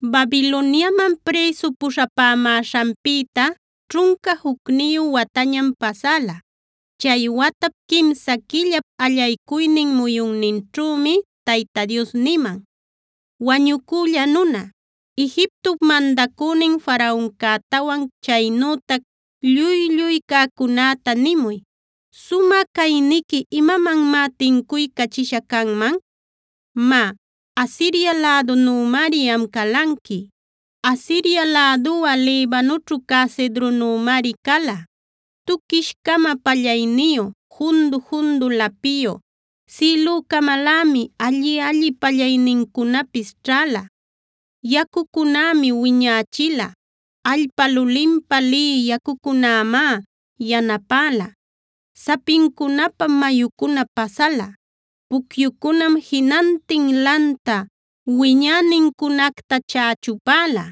Babiloniaman prïsu puśhapämäśhanpïta ćhunca jucniyu watañam pasäla. Chay watap quimsa quillap allaycuynin muyunninćhümi Tayta Dios niman: “Wañucülla nuna, Egiptop mandacünin Faraoncätawan chaynütac lluy-lluy cäcunäta nimuy: “¿Sumä cayniqui imamanmá tincuycachisha canman? Má, Asiria lädunümari am calanqui, Asiria läduꞌa Libanoćhu cä cedronümari cala. Tuquish-cama pallayniyu, jundu-jundu lapiyu, sïlücamalämi alli-alli pallaynincunapis ćhäla. Yacucunämi wiñächila. Allpa lulinpä lï yacucunämá yanapäla. Sapincunapam mayucuna pasala. Pucyucunam jinantin lanta wiñänincunacta chächupäla.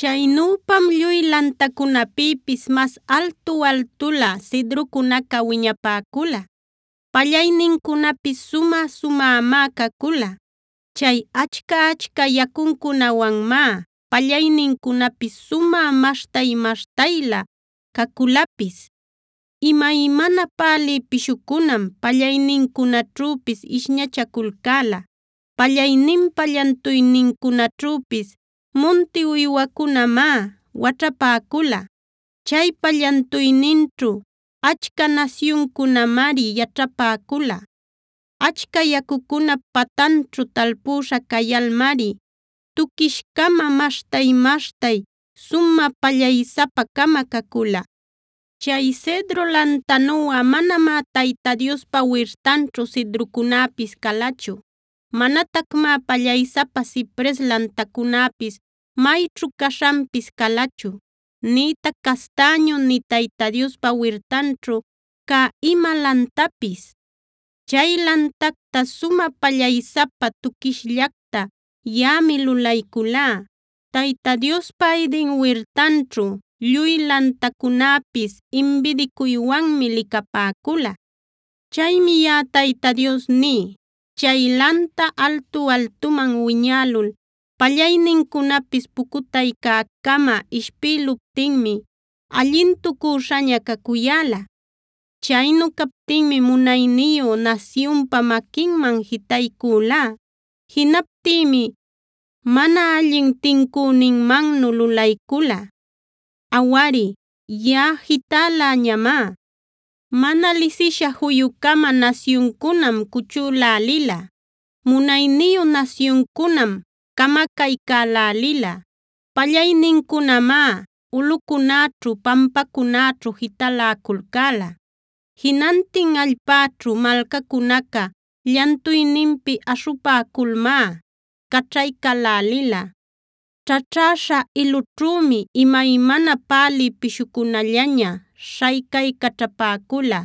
“Chaynüpam lluy lantacunapïpis mas altu-altulä cedrocunaca wiñapäcula; pallaynincunapis sumä-sumämá cacula. Chay achca-achca yacuncunawanmá pallaynincunapis sumä maśhtay-maśhtaylä caculapis. Imaymana pälï pishucunam pallaynincunaćhüpis ishñachaculcäla. Pallayninpa llantuynincunaćhüpis munti uywacunamá waćhapäcula. Chaypa llantuyninćhu achca nasyuncunamari yaćhapäcula. “Achca yacucunap patanćhu talpüśha cayalmari tuquish-cama, maśhtay-maśhtay sumä pallaysapa-cama cacula. Chay cedro lantanuꞌa manamá Tayta Diospa wirtanćhu cedrocunäpis calachu. Manatacmá pallaysapa cipres lantacunäpis mayćhu caśhanpis calachu, nïtac castäñu nï Tayta Diospa wirtanćhu cä ima lantapis. Chay lantacta sumä pallaysapa, tuquishllacta yaꞌami lulayculá. Tayta Diospa Eden wirtanćhu lluy lantacunäpis imbidicuywanmi licapäcula. “Chaymi yaꞌa Tayta Dios ní: Chay lanta altu-altuman wiñälul, pallaynincunapis pucutaycäcama ishpïluptinmi allintucüśhaña cacuyäla. Chaynu captinmi munayniyu nasyunpa maquinman jitaycülá. Jinaptïmi mana allin tincüninmannu lulaycula. Awari, yaꞌa jitäläñamá. Mana lisisha juyu-cama nasyuncunam cuchülälila; munayniyu nasyuncunam camacaycälälila. Pallaynincunamá ulꞌucunäćhu pampacunäćhu jitaläculcäla. Jinantin allpäćhu malcacunaca llantuyninpi aśhupäculmá caćhaycälälila. Ćhaćhäśha ilunćhümi imaymana pälï pishucunallaña śhaycaycaćhapäcula.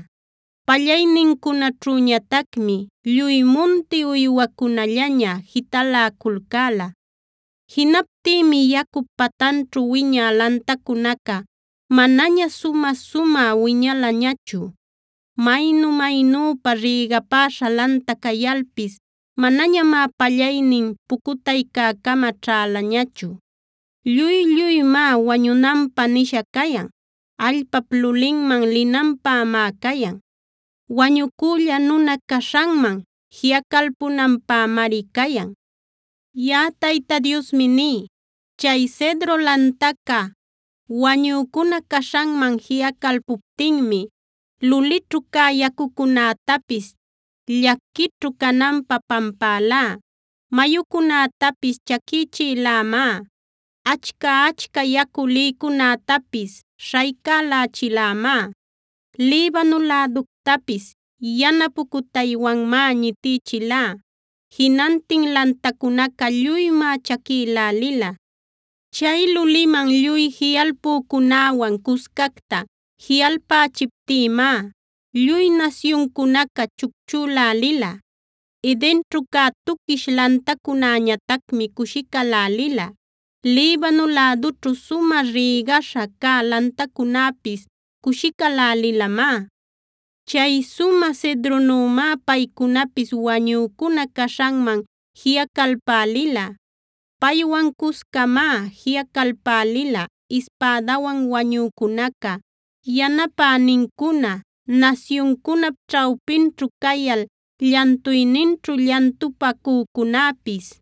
Pallaynincunaćhüñatacmi lluy munti uywacunallaña jitaläculcäla. Jinaptïmi yacup patanćhu wiñä lantacunaca manaña sumä-sumä wiñalañachu. Maynu-maynüpa rïgapäśha lanta cayalpis manañamá pallaynin pucutaycäcama ćhälañachu. Lluy-lluymá wañunanpä nisha cayan; allpap lulinman linanpämá cayan. Wañucülla nuna caśhanman jiꞌacalpunanpämari cayan. “Yaꞌa Tayta Diosmi ní: Chay cedro lantaca wañücuna caśhanman jiꞌacalpuptinmi lulićhu cä yacucunätapis llaquićhu cananpä pampälá. Mayucunätapis chaquïchïlämá; achca-achca yacu lïcunätapis śhaycächilämá. Libano läductapis yana pucutaywanmá ñitïchilá; jinantin lantacunaca lluymá chaquïlälila. Chay luliman lluy jiꞌalpücunäwan cuscacta jiꞌalpächiptïmá lluy nasyuncunaca chucchülälila. Edenćhu cä tuquish lantacunäñatacmi cushicälälila. Libano lädućhu sumä rïgaśha cä lantacunäpis cushicälälilamá. Chay sumä cedronümá paycunapis wañücuna caśhanman jiꞌacalpälila. Paywan cuscamá jiꞌacalpälila ispädawan wañücunaca, yanapänincuna, nasyuncunap ćhawpinćhu cayal llantuyninćhu llantupacücunäpis.